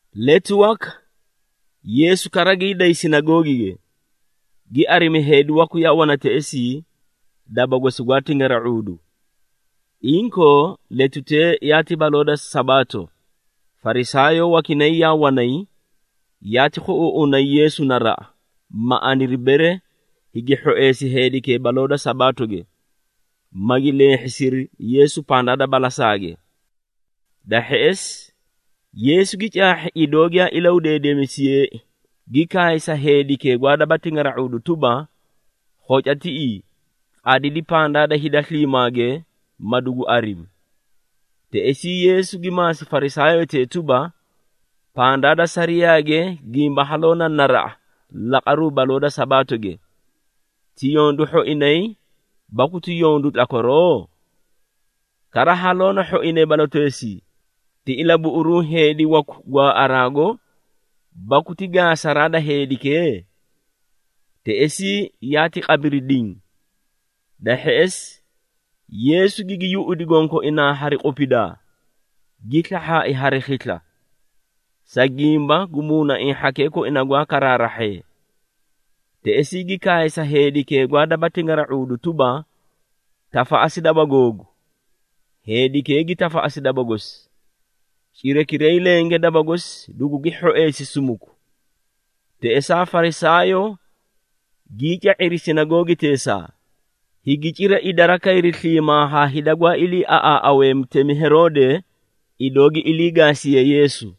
Letu waka Yeesu kara gii day sinagoogige, gi arimi heedi waku yaa wana teꞌesii, daba gosi gwaa tingara⁄uudu. Inkoo, letutee yaati baloo da Sabaato, Farisaayoo wakinay yaa wanay, yaati khuꞌuuꞌunay Yeesu naraꞌa, ma aniri, bere higi hhoeesi heedikee baloo da Sabaatoge, magi leehhisiri Yeesu pandaa da balasaage. Da hheꞌesi Yeesu gi caahhi idoo giyaa ilahudeedemisiyeei, gi kaay sa heedikee gwaa daba tingara⁄uudu tuba, “Khoca tiꞌii, qadidi pandaa da hida sliimaage, ma dugu arimi.” Teꞌesii Yeesu gi maasi Farisaayotee tuba, “Pandaa da sariyaage gimba haloo na naraꞌa laqaruu baloo da Sabaatoge, ti yondu hhoinay baku ti yondu tlakwaroo? Kara haloo na hhoinay baloteesii, ti ilabuꞌuruu heedi waku gwaaꞌaraago baku ti gaasaraa da heedikee?” Teꞌesii yaati qabiri diĩ. Da hheꞌesi, Yeesu gigi yuꞌudi gonkoinaa hari qupidaa, gi slahhaai hari khisla, sa gimba gu muunaiĩ hhakee koina gwaa karaarahhee. Teꞌesii gi kaay sa heedikee gwaa daba tingara⁄uudu tuba, “Tafaꞌasi daba googu!” Heedikee gi tafaꞌasi daba gosi, cirakiray lenge daba gosi dugugi hhoeesi sumuku. Teꞌesaa Farisaayoo gii ca⁄iri sinagoogiteesaa, higi cira idara kayri sliimaa haa hida gwaa iliiaꞌaaꞌawee mutemi Heroode, idoo gi ilii gaasiyee Yeesu.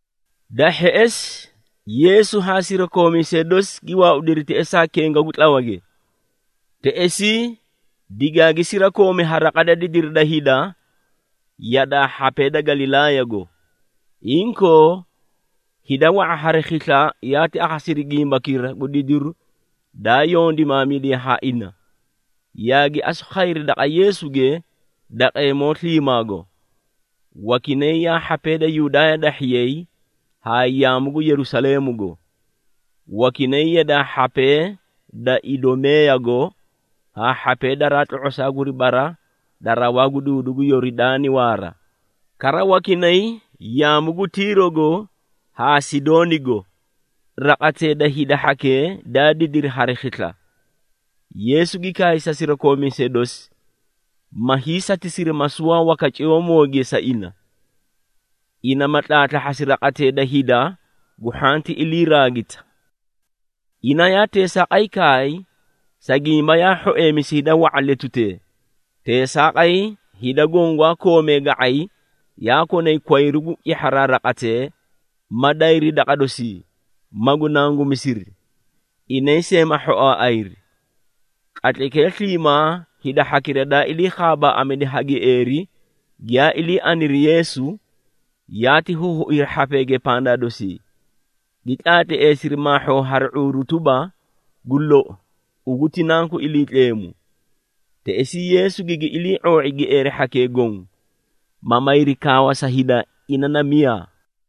Da hheꞌesi, Yeesu haa sirakoomiisee dosi gi waaudiri teꞌesaa kenga gu tlawage, teꞌesii digaagi sirakoomi ha raqa da didiri da hida yadaa hhapee da Galilaayago. Inkoo hida wa⁄a hari khisla yaati akhasiri gimbakira gu didiru daa yondimaamidiye ha ina, yaagi asu khayri daqa Yeesuge daqeemoo sliimaago. Wakinay yaa hhapee da Yudaaya dahhiyay haa yaamu gu Yerusaleemugo, wakinay yadaa hhapee da Idumeeyago haa hhapee daraa tlo⁄osaa guri bara da rawaa gu duudu gu Yoridaani waara. Kara wakinay yaamu gu Tiirogo haa Sidoonigo, raqatee da hida hhakee daa didiri hari khisla. Yeesu gi kaay sa sirakoomiisee dosi, ma hiisatisiri masuwaa waka ciyoomooge sa ina, ina ma tlaatlahhasi raqatee da hida gu hhanti iliiraagita. Ina yaa teesaaqay kaay, sa gimba yaa hhoeemisi hida wa⁄a letutee, teesaaqay hida goõ gwaa koomee ga⁄ay yaa konay kwayru gu cihharaa raqatee, ma dayri daqa dosii, magu nangumisiri, inay see ma hhoaaꞌayri. Qatlaykee sliimaa hida hhakira daa ilii khaabaaꞌamidi ha gieeri, giyaa ilii aniri Yeesu, yaati huhuiri hhapeege pandaa dosii, gi tlaatleesiri maahhoo hari ⁄uuru tuba, “Gu lou, ugu ti Nanku Iliitleemu!” Teꞌesii Yeesu gigi ilii⁄oo⁄i gieeri hhakee goõ, ma mayri kaawa sa hida, ina na miyaa.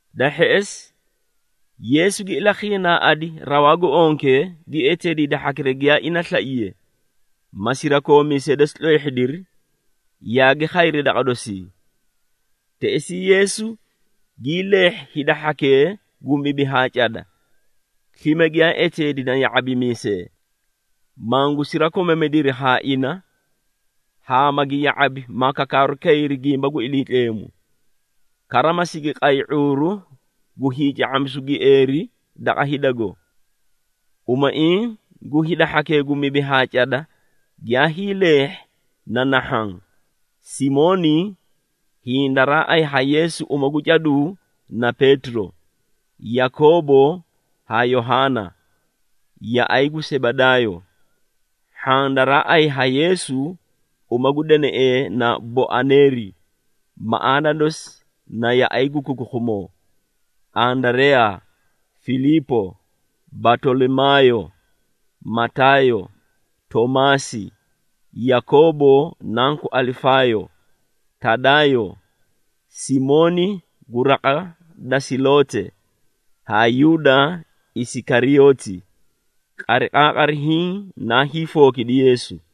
Da hheꞌesi, Yeesu gi ilakhiinaaꞌadi rawaa gu onke, gi eteedi hida hhakira giyaa ina slaiye, ma sirakoomiisee dosi tleehhidiri, yaagi khayri daqa dosii. Teꞌesii Yeesu gii leehhi hida hhakee gu mibi haa cada, slime giyaa eteedi na ya⁄abimiisee, mangu sirakomamidiri haa ina, haa magi ya⁄abi ma kakaaru kayri gimba gu Iliitleemu, kara ma sigi qay ⁄uuru gu hiica⁄amisu gu gieeri daqa hidago. Umaiĩ gu hida hhakee gu mibi haa cada giyaa hiileehhi na nahhaã, Simooni (hiĩ daraa ayi ha Yeesu uma gu caduu na Peetiro), Yakoobo haa Yohaana, yaꞌay gu Sebedaayo (hhaã daraa ayi ha Yeesu uma gu deneꞌee na Boaneeri, maꞌaana dosi na “Yaꞌay gu Kukukhumoo,”) Andareyaa, Filiipo, Batolimaayo, Mataayo, Toomaasi, Yakoobo nanku Alifaayo, Tadaayo, Simooni gu raqa da Seloote, haa Yuuda Isikariyooti. Qariqaaqari hiĩ naa hiifookidi Yeesu.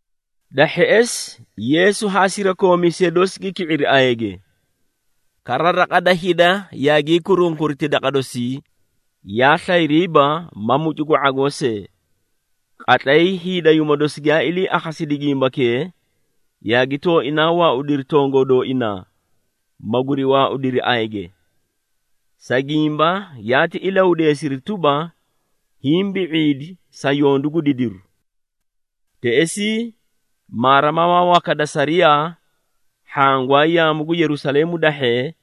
Da hheꞌesi Yeesu haa sirakoomiisee dosi gi ki⁄iri ayage. Kara raqa da hida yaagii kurunkuriti daqa dosii, yaa slayriiba ma mucu gu ⁄agoo see. Qatlay hiidayuuma dosi giyaa ilii akhasidi gimbakee, yaagi tooinaa waaudiri tongoo dooinaa, maguri waaudiri ayage, sa gimba yaati ilahudeesiri tuba, “Hiĩ bi⁄iidi sa yondu gu didiru!” Teꞌesii maarimamaa waka da sariyaa, hhaã gwaa yaamu gu Yerusaleemu dahhee,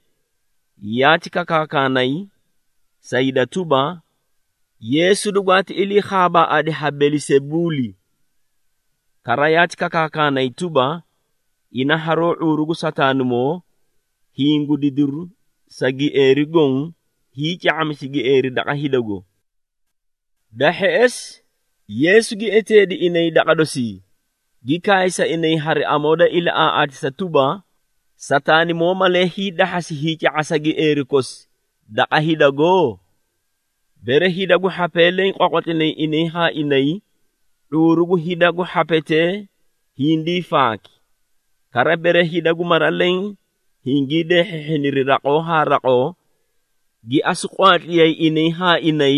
yaati kakaakaanay sa hida tuba, “Yeesu dugwaati ilii khaabaaꞌadi ha Belisebuuli.” Kara yaati kakaakanay tuba, “Ina haroó ⁄uuru gu Sataanimoo, hiĩ gu didiru sa gieeri goõ, hiica⁄amisi gieeri daqa hidago.” Da hheꞌesi, Yeesu gi eteedi inay daqa dosii, gi kaay sa inay hari amoo da ilaꞌaaꞌaatisa tuba, “Sataanimoo malee hii dahhasi hiica⁄asa gieeri kosi daqa hidago? Bere hida gu hhapee leẽ qwaqwatlinay inay haa inay, ⁄uuru gu hida gu hhapetee hindii faaki. Kara bere hida gu mara leẽ hingii deehhiihhiniri raqoo haa raqoo, gi asu qwaatliyay inay haa inay,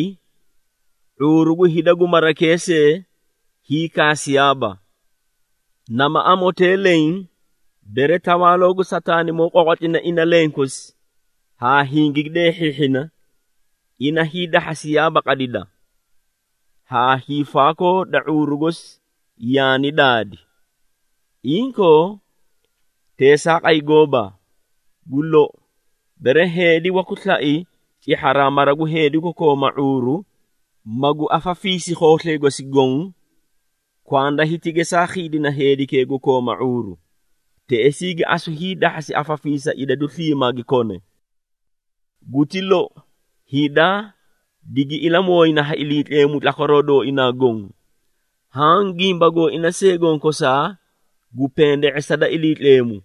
⁄uuru gu hida gu marakee see hiikaasiyaaba. Nama amotee leẽ, bere tawaaloo gu Sataanimoo qwaqwatlina ina lenkosi haa hingigi deehhiihhina, ina hiidahhasiyaaba qadida, haa hiifaakoo da ⁄uuru gosi yaani daadi. Inkoo teesaaqay gooba! Gu lou, bere heedi waku slai cihharaa mara gu heedi gu kooma ⁄uuru, magu afafiisi khooslay gosi goõ, kwanda hiti gesaa khiidina heedikee gu kooma ⁄uuru. Teꞌesii gi asu hiidahhasi afafiisa idadu sliimaa gi kone. Guti lou, hida digi ilamooyina ha Iliitleemu tlakwaroo dooina goõ, haã gimba gooina see gonkosaa gu pende⁄esa da Iliitleemu.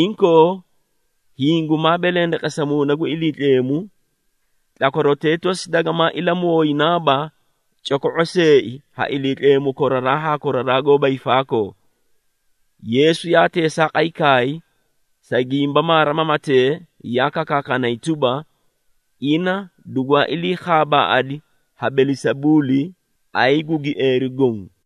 Inkoo, hiĩ gumaa belendeqesa Muuna gu Iliitleemu, tlakwarotee tosi dagamaa ilamooyinaaba coko⁄o seei ha Iliitleemu koraraa haa koraraa goóba hiifaakoo.” Yeesu yaa teesaaqay kaay, sa gimba maarimamatee yaa kakaakanay tuba, “Ina dugwaa iliikhaabaꞌadi ha Belisebuuli, ayi gu gieeri goõ!”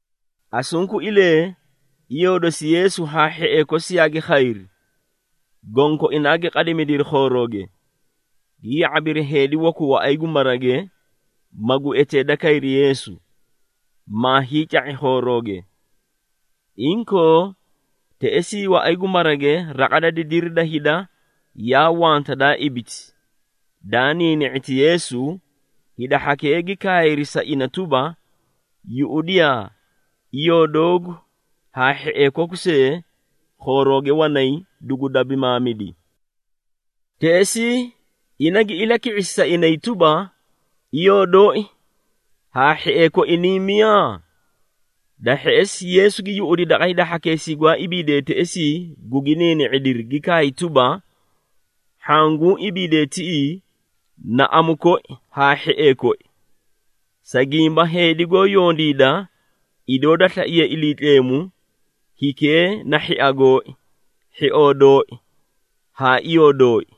Asunkuilee, iyoo dosi Yeesu haa hhiee kosi yaagi khayri. Gonkoinaa gi qadimidiri khoorooge, gi ya⁄abiri heedi waku waꞌay gu marage, magu eteeda kay Yeesu, maa hiica⁄i khoorooge. Inkoo, teꞌesii waꞌay gu marage raqa da didiri da hida yaa wanta daa ibiti, daa niini⁄iti Yeesu, hida hhakee gi kaayri sa ina tuba, “Yuꞌudiyaa, iyoo doogu haa hhiee koku see khoorooge wanay, dugu dabimaamidi.” Teꞌesii ina gi ilaki⁄isi sa inay tuba, “Iyoo dooi haa hhiee koi niĩ miyaa?” Da hheꞌesi, Yeesu gi yuꞌudi daqa hida hhakeesii gwaa ibiidee teꞌesii gugi niini⁄idiri, gi kaay tuba, “Hhaã guũ ibiidee tiꞌii na amu koi haa hhiee koi, sa gimba heedi goó yondiida idoo da slaiye Iliitleemu, hikee na hhia gooi, hhioo dooi haa iyoo dooi.”